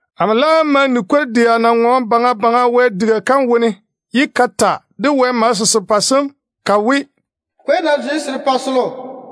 Amo laam ma ni kwor-dɛa na ŋɔɔne baŋa baŋa Wɛ diga kam wone, ye ka ta de Wɛ malese serepɛ sem ka we, “Kwei-na zwe serepɛ selo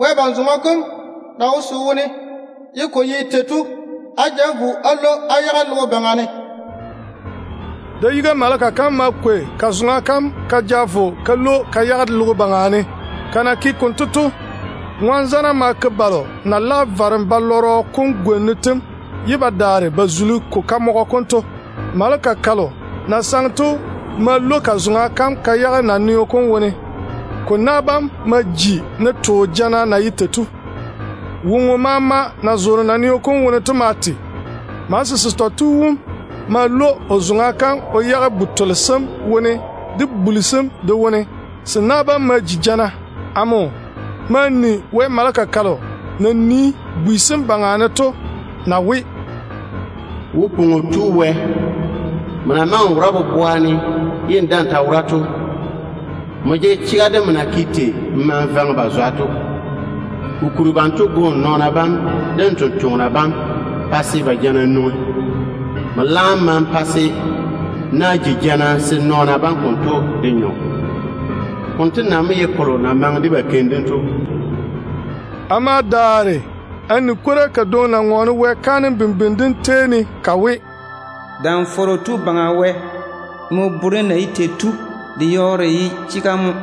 Wɛ ban-lom dem na wo se wone to á ja vo á lwo á yage logo baŋa ne.” Da-yiga maleka kam ma kwei ka zoŋa kam ka ja vo ka lwo ka yage logo baŋa ne. Ka na ke konto to, ŋɔn-zana ma ja balo na lage varem wom gwona yam ye ba zuli ko kamɔgɔ kom to. Maleka kalo na saŋe to ma lwo ka zoŋa kam ka yage naneo kom wone. Ko na bam ma ji ne too jana na ye tei to. Woŋo maama na zoore naneo kom wone to ma te. Malese setɔ tu wom ma lwo o zoŋa kam o yage bu-tole sem wone de buli sem de wone. Se na bam ma ji jana. Amo ma ni Wɛ maleka kalo na nii bwi sem baŋa ne to na we: “Wo-pwoŋo Tu Baŋa Wɛ, nmo na maŋe n wora boboa ne ye n daa‑n ta wora to, nmo tɔge chega de nmo na ke tei n waare-ba to. Kokuri banto go n nɔɔna bam de n sampwori sem pa se ba jana nwoŋi. Nmo laam ma‑n pa na bam ji jana se nɔɔna bam konto de nyɔ. Mo kolo na maŋe de ba keim dem to.” Amo ma daare a ni kwora kadwoŋi na ŋɔɔne Wɛ kaanem bimbini dem seeni ka we: “Dam-fɔrɔ Tu Baŋa Wɛ, nmo na di nɔɔna taane tei to yɔɔre ko tɔge chega mo.”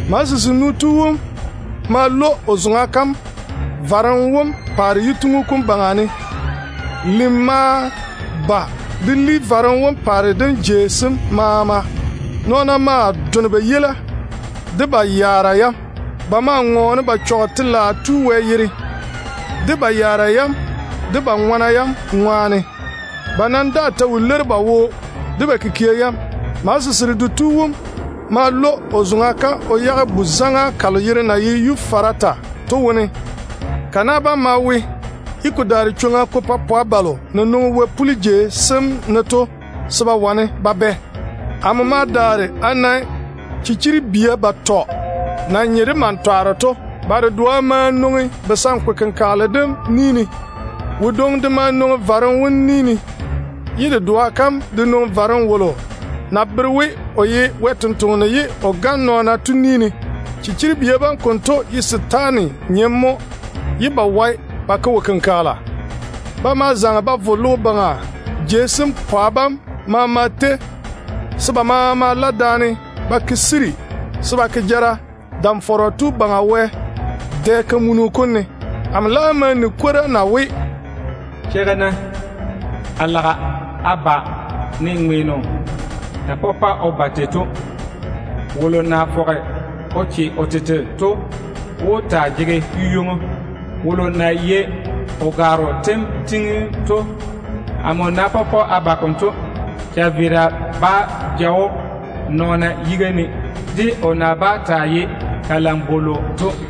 Malese senu tu wom ma lwo o zoŋa kam varem wom paare yituŋu kom baŋa ne. Lim ma ba de li varem wom paare dim jei sem maama. Nɔɔna ma done ba yeila de ba yaara yam. Ba ma ŋɔɔne ba twe Telaao Tu Wɛ wom, ba yaara yam de ba yera ŋɔna yam ŋwaane. Ba nam daa ta wo leiri ba wo de ba kikia yam. Malese seredo tu wom ma lwo o zoŋa kam o yage Yuferata bu-zaŋa kam wone. Ka na bam ma we, ye ko daare chwoŋa ko pa pwa balo na nwoŋi wɛ-puli jei sem ne to se ba wane ba bɛ. Amo ma daare a na chichiri-zɔɔna yatɔ na nye de mantwaaro to. Ba dedoa ma nwoŋi kayanchɔrɔ kom ni ne. Wodwoŋi de ma nwoŋi varem wom ni ne, ye dedoa kam de nwoŋi varem wolo na bere we o ye Wɛ sampwora ye o gane nɔɔna to ni ne. Chichiribia bam konto ye setaane nyena mo, ye ba wae ba ke wo-kenkagela. Ba ma zaŋe ba vo logo baŋa pwa bam maama tei se ba maama la daane ba ti ba yiga jara ŋwaane Dam-fɔrɔ Tu Baŋa Wɛ dɛ-kamunu kom dɛ ne. Yezu tage o we: “Cheigi-na. A lage a ba ne ŋweeno na dare o ba tei to mo. Wolo na fɔge o che o tete to wó taa jege yu-ywoŋo. Wolo na yei o gwaaro tem tiŋim to, amo ná pɔpɔ a ba konto, chaveera bá ja‑o nɔɔna yiga ne, o na bá zaŋe de kuri-nɔrɔ to ŋwaane.”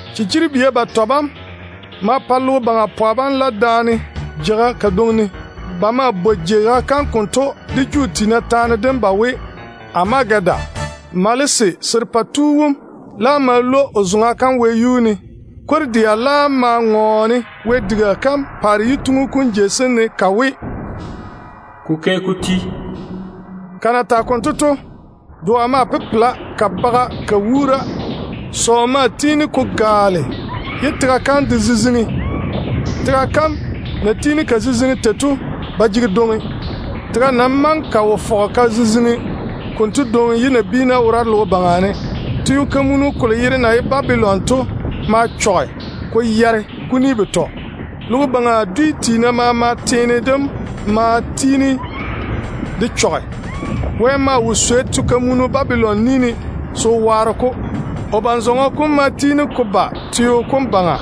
Chichiribia batɔ bam ma pa logo baŋa pwa bam la daane jeiga kadwoŋi ne. Ba maa bwoi jeiga kam konto de Juu tiina taane ba we, ‘Amagedon’. Malese serepɛ tu wom laam ma lwo o zoŋa kam wɛyuu ne. Kwor-dɛa laam ma ŋɔɔne Wɛ diga kam paare yituŋu kom jei sem ne ka we, “Ko ke ko ti.” Ka na tage konto to, doa maa pepela ka baga ka wuura. Sɔɔ ma tiini ko gaale ye tega kam de ziziŋi. Tega kam na tiini ka ziziŋi tei to ba jege dwoŋi. Tega nam maŋe ka wo ziziŋi konto dwoŋi ye nabiina wora logo baŋa ne. Te-fɔrɔ kolo yere na ye Babilon to ma yare kuni betɔ ko chɔge. Logo baŋa dwi tiina teene dem maama de ma vi tega ne. Wɛ maa wo swei te-fɔrɔ Babilon ni ne se o waare-ko. O ban-zɔŋɔ kom ma tiini ko ba teo kom baŋa,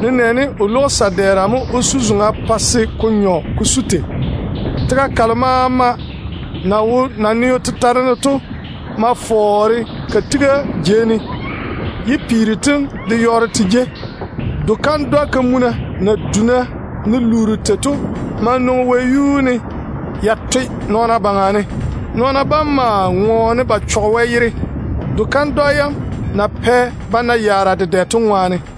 nenɛɛne o lwogi sa-dɛɛra mo o su na-zoŋa pa se ko nyɔ ko su tei. Tega kalo maama na wo naneo tetare ne to ma fɔɔre ka tiga jei ne, ye peero tem de yɔɔre te jei. Do-kandwa na duna ne luuru tei to maa nwoŋi wɛyuu ne ya toe nɔɔna baŋa ne. Nɔɔna bam ma ŋɔɔne ba twe Wɛ yere, do-kandwa yam na pɛ ba na yaara dedɛ to ŋwaane.